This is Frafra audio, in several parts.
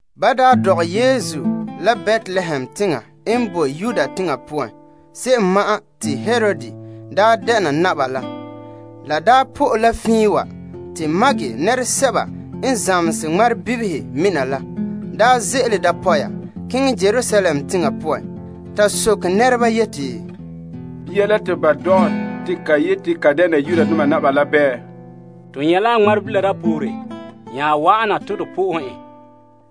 Ba daa dɔgɛ Yesu la Betlehem teŋa n boe Yudea teŋa poan, se'em ma'an te Herod daa dɛna naba la. La daa po'e la fiin wa, te yamdoma n zamehe ŋmarebibihe mina la, ze'ele dapɔya keŋɛ Yerusalem teŋa poan, ta soke nɛreba yeti, Bia la te ba dɔgɛ te ka yeti ka dɛna Yudoma naba la bɛɛ? To nyɛ' la a ŋmarebila dapoore nya wa'ana te to na'ahe en.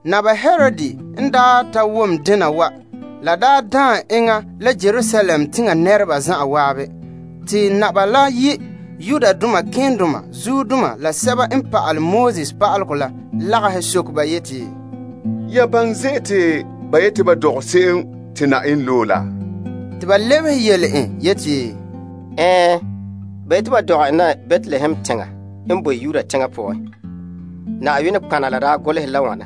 Naba Herod n ta wom dena wa, la daam enŋa la Yerusalem teŋa nɛreba zan'an. Te naba la yi' malema keendoma la sɛba n pa'alɛ Pa'alegɔ la lagahɛ soke ba yeti, Ya baŋɛ zen'an te ba yeti ba dɔgɛ se'em te Na'ayenɛ loe la? Te ba lebehe yele en yeti, Ɛɛn, ba yeti ba dɔgɛ en la Betlehem teŋa n boe Yudea teŋa poan. Na'ayenɛ nɔtɔgɔha la daa golehe yeti,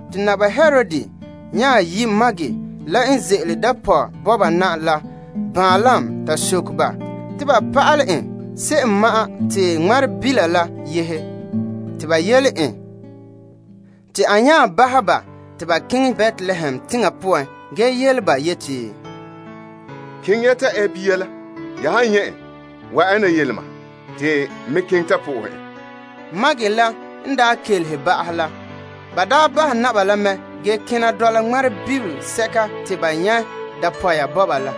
Te Naba Herod nya yi' yamdoma la n ze'ele dapɔya bɔba na la baanlam ta soke ba te ba pa'alɛ en se'em ma'an te ŋmarebila la yehe. Te ba yele en. Te a nya bahɛ ba te ba keŋɛ Betlehem teŋa poan ge yele ba yeti, Keŋɛ ya ta ɛ bia la. Ya han nyɛ' en, wa'an ya na yele mam, te n me keŋɛ ta na'ahe en. Ba la n daa kelehe ba'ahɛ la, ba bahɛ naba la mɛ ge kena dɔla ŋmarebilisɛka te ba nyɛ' dapɔya bɔba la.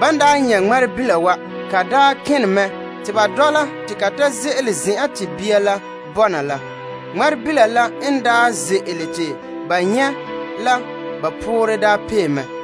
Ban nyɛ' ŋmarebila wa, ka daa kene mɛ te ba dɔla te ka ta ze'ele zen'an te bia la bɔna la. Ŋmarebila la n daa ze'ele te ba nyɛ' la ba poorɛ daa pee mɛ.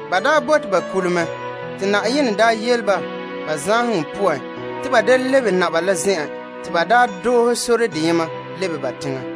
Ba daa bote ba kule mɛ, te Na'ayenɛ yele ba, ba zaanheŋɔ poan te ba da lebe naba la zen'en te ba doohe sore deyema lebe ba teŋa.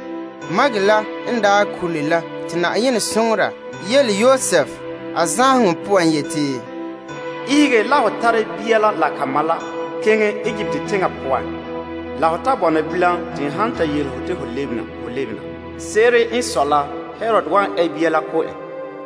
Ban daa kule la te Na'ayenɛ soŋora yele Yosef a zaanheŋɔ poan yeti, Ihege la ho tare bia la la ka ma la keŋɛ Egipt teŋa poan la ho ta bɔna bilam te n han ta yele ho te ho lebena ho lebena. Se'ere n sɔe la Herod wan ɛ bia la ko' en.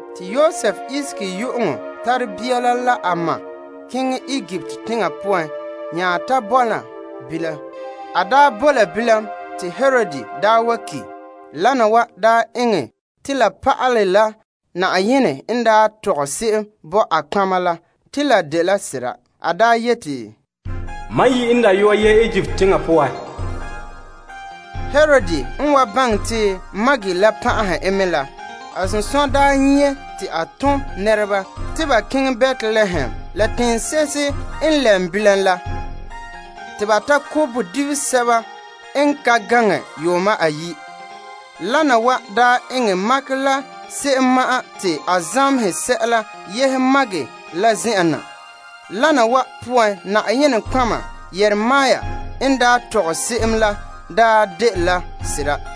Te Yosef ihege yu'uŋɔ tare bia la la a ma keŋɛ Egipt teŋa poan nya ta bɔna bilam. A daa bo la bilam te Herod daa wa ki'. Wana wa daa eŋɛ te la pa'alɛ la Na'ayenɛ n tɔgɛ se'em bo a nɔtɔgɔha la te la de sera. La yeti, Mam yi n dayɔa wa ze'ele Mizraim poan yehe na. Herod n daa wa baŋɛ te ba la pan'ahɛ en mɛ la, a sunsunya n nyie te a tom nɛreba te ba keŋɛ Betlehem la teŋse'ehe n lɛm bilam la, te ba ta ko' bodibinto seto n ka gaŋɛ yuuma ayi'. A eŋɛ wana wa la yɛhera la enŋa n baŋɛ se'ere ŋmarebila la yɛhega poan la. Wana wa poan Na'ayenɛ nɔtɔgɔha Yeremia n daa tɔgɛ se'em la daa dela sera: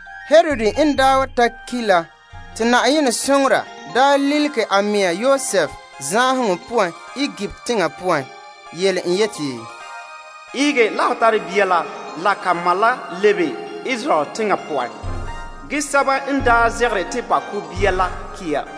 Herod n daa ta ki' la te Na'ayenɛ soŋora lilige a mɛŋa Yosef zaanheŋɔ poan Egipt teŋa poan, yele en yeti, Ihege la ho tare bia la, la ka ma la lebe Israel teŋa poan, ge sɛba n daa zegere te ba ko' bia la ki' ya.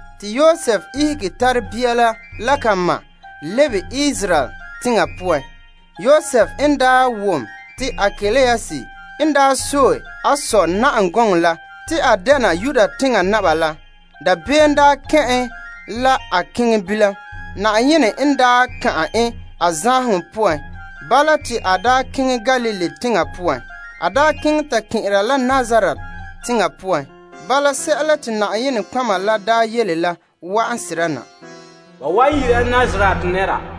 Te Yosef ihege tare bia la la ka ma la lebe Israel teŋa poan. Yosef n daa wom te Arkelaus n sɔe a sɔ na'am gɔŋɔ la, te a dɛna Yudea teŋa naba la, dabeem kɛn' en la a keŋɛ. Na'ayenɛ n ka'an en a zaanheŋɔ poan, bala te a ton keŋɛ Galilee teŋa poan. A daa keŋɛ ta kɛn'ɛra la Nazaret teŋa poan. Bala, sɛla te nɔtɔgɔheba la daa yele la wa'an sera na te ba wan yi'ira en Nazaret nɛra.